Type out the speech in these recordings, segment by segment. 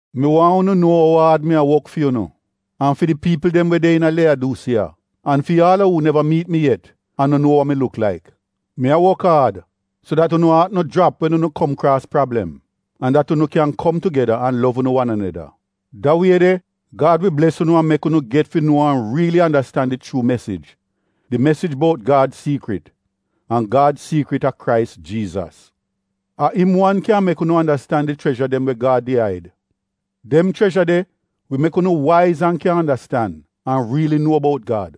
Mi waahn unu nuo ou aad mi a wok fi unu, an fi di piipl dem we de iina Leyadusiiya an fi aal a uu neva miit mi yet an no nuo wa mi luk laik. Mi a wok aad, so dat unu aat no jrap wen unu kom kraas prablem, an dat unu kyan kom tugeda an lov unu wan aneda. Da wie de Gad wi bles unu an mek unu get fi nuo an riili andastan di chuu mesij — di mesij bout Gad siikrit, an Gad siikrit a Krais Jiizas. A im wan kyan mek unu andastan di chrezha dem we Gad did aid. Dem chrezha de wi mek unu waiz an kyan andastan, an riili nuo bout Gad.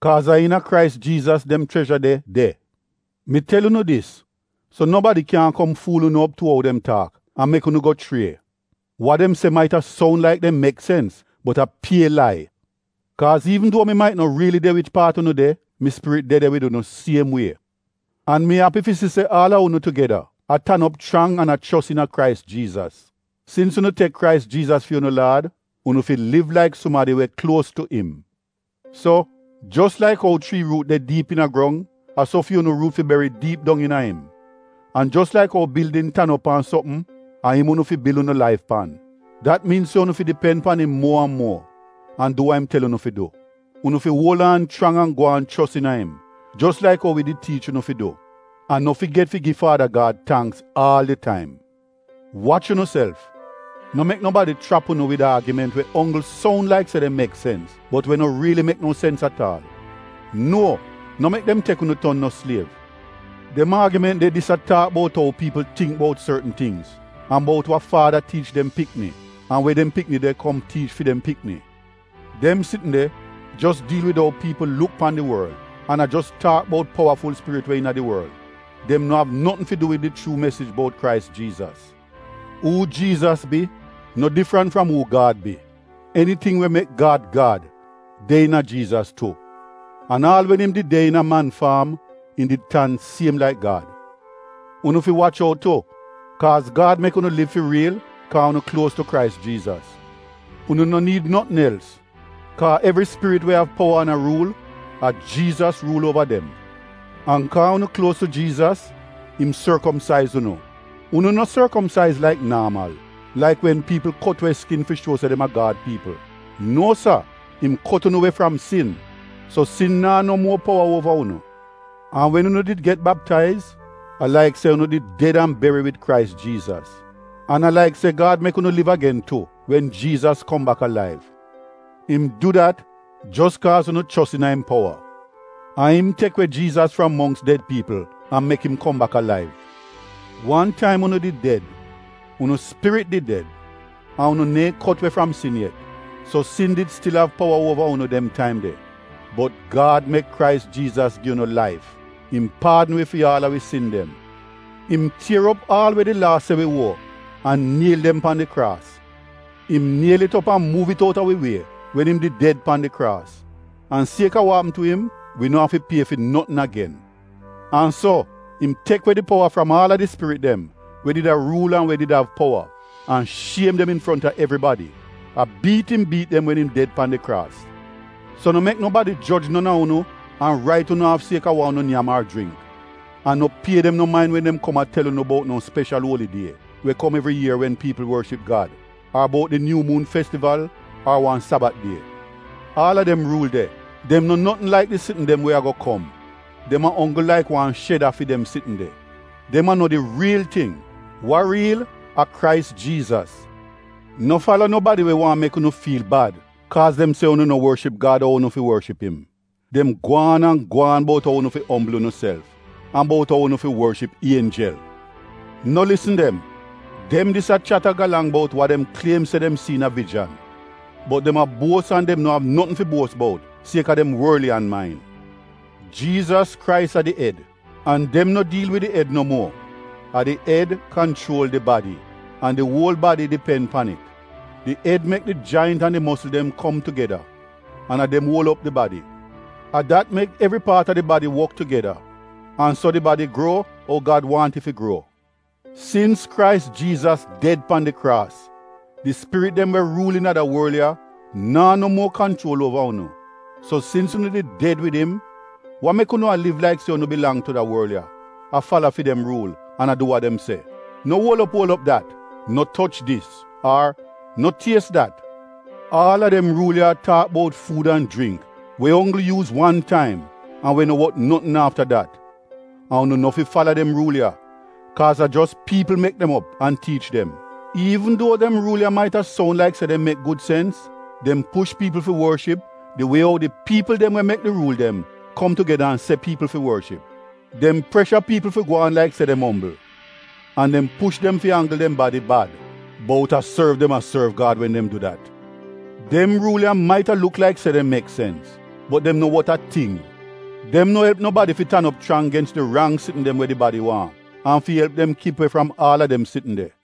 Kaaz a iina Krais Jiizas dem chrezha de de. Mi tel unu dis so nobadi kyaahn kom fuul unu op tu ou dem taak, an mek unu go schrie. Wa dem se maita soun laik dem mek sens bot a pie lai. Kaaz iivn duo mi mait no riili de wich paat unu de, mi spirit de de wid unu siem wie. An mi api fi si se aal a unu tugeda, a tan op chrang an a chos iina Krais Jiizas. Sins unu tek Krais Jiizas fi unu Laad, unu fi liv laik sumadi we kluos tu im. So, jos laik ou chrii ruut de diip iina grong, a so fi unu ruut fi beri diip dong iina im. An jos laik ou bildin tan op pan sopm, a im unu fi bil unu laif pan. Dat miin se unu fi dipen pan im muo an muo an du wa im tel unu fi du. Unu fi uol aan chrang an gwaan chos iina im jos laik ou wi did tiich unu fi du. An no figet fi gi Faada Gad tangks aal di taim. Wach unuself! No mek nobadi chrap unu wid aagiment we onggl soun laik se dem mek sens, bot we no riili mek no sens at aal. Nuo! No mek dem tek unu ton no sliev. Dem aagiment de dis a taak bout ou piipl tingk bout sortn tingz, an bout wa faada tiich dem pikni, an we dem pikni de kom tiich fi dem pikni. Dem sitn de jos diil wid ou piipl luk pan di worl an a jos taak bout powaful spirit we iina di worl. Dem no av notn fi du wid di chuu mesij bout Krais Jiizas. Uu Jiizas bi no difrant fram uu Gad bi. Eniting we mek Gad Gad, de iina Jiizas tu, an aal wen im did de iina man faam im did tan siem laik Gad. Unu fi wach out tu, kaaz Gad mek unu liv fi riil kaa unu kluos tu Krais Jiizas. Unu no niid notn els kaa evri spirit we av powa an a ruul, a Jiizas ruul uova dem. An kaa unu kluos tu Jiizas im sorkomsaiz unu. Unu no sorkomsaiz laik naamal, laik wen piipl kot we skin fi shuo se dem a Gad piipl. Nuo sa, im kot unu we fram sin. So sin naa no muo powa uova unu. An wen unu did get baptaiz, a laik se unu did ded an beri wid Krais Jiizas. An a laik se Gad mek unu liv agen tu wen Jiizas kom bak alaiv. Im du dat jos kaaz unu chos iina im powa. A im tek we Jiizas fram mongks ded piipl an mek im kom bak alaiv. Wan taim unu did ded. Unu spirit did ded, an unu neehn kot we fram sin yet. So sin did stil av powa uova unu dem taim de. Bot Gad mek Krais Jiizas gi unu laif. Im paadn wi fi aal a wi sin dem. Im tier op aal we di Laa se wi uo, an niel dem pan di kraas. Im niel it op an muuv it out a wi wie, wen im did ded pan di kraas. An sieka wa apm tu im, wi no afi pie fi notn agen. An so, im tek we di powa fram aal a di spirit dem we did a ruul an we did av powa, an shiem dem infronta evribadi. A biit im biit dem wen im ded pan di kraas. So no mek nobadi joj non a unu an rait unu aaf sieka wa unu nyam ar jringk. An no pie dem no main wen dem kom a tel unu bout no speshal uoli die we kom evri ier wen piipl worship Gad, ar bout di Nyuu Muun Festival ar wan Sabat die. Aal a dem ruul de, dem no notn laik di sitn dem we ago kom. Dem a onggl laik wan sheda fi dem sitn de; dem a no di riil ting. Wa riil, a Krais Jiizas. No fala nobadi we waahn mek unu fiil bad kaaz dem se unu no worship Gad ou unu fi worship im. Dem gwaan an gwaan bout ou unu fi ombl unuself, an bout ou unu fi worship ienjel. No lisn dem. Dem dis a chat a galang bout wa dem kliem se dem si iina vijan. Bot dem a buos an dem no av notn fi buos bout sieka dem worliyan main. Jiizas Krais a di ed, an dem no diil wid di ed no muo. A di ed kanchuol di badi. An di uol badi dipen pan it. Di ed mek di jaint an di mosl dem kom tugeda, an a dem uol op di badi. A dat mek evri paat a di badi wok tugeda, an so di badi gruo ou Gad waahn it fi gruo. Sins Krais Jiizas ded pan di kraas, di spirit dem we ruul iina da worl ya naa no muo kanchuol uova unu. So sins unu did ded wid im, wa mek unu a liv laik se unu bilang tu da worl ya — a fala fi dem ruul an a du wa dem se? “No uol op uol op dat!”, “No toch dis!” Ar “No ties dat!” Aal a dem ruul ya a taak bout fuud an jringk we onggl yuuz wan taim an we no wot notn afta dat. An unu no fi fala dem ruul ya, kaaz a jos piipl mek dem op an tiich dem. Iivn duo dem ruul ya maita soun laik se dem mek gud sens, dem push piipl fi worship di wie ou di piipl dem we mek di ruul dem kom tugeda an se piipl fi worship; dem presha piipl fi gwaan laik se dem ombl; an dem push dem fi anggl dem badi bad — bout a sorv dem a sorv Gad wen dem du dat. Dem ruul ya maita luk laik se dem mek sens, bot dem no wot a ting. Dem no elp nobadi fi tan op chrang gens di rang sitn dem we di badi waahn, an fi elp dem kip we fram aal a dem sitn de.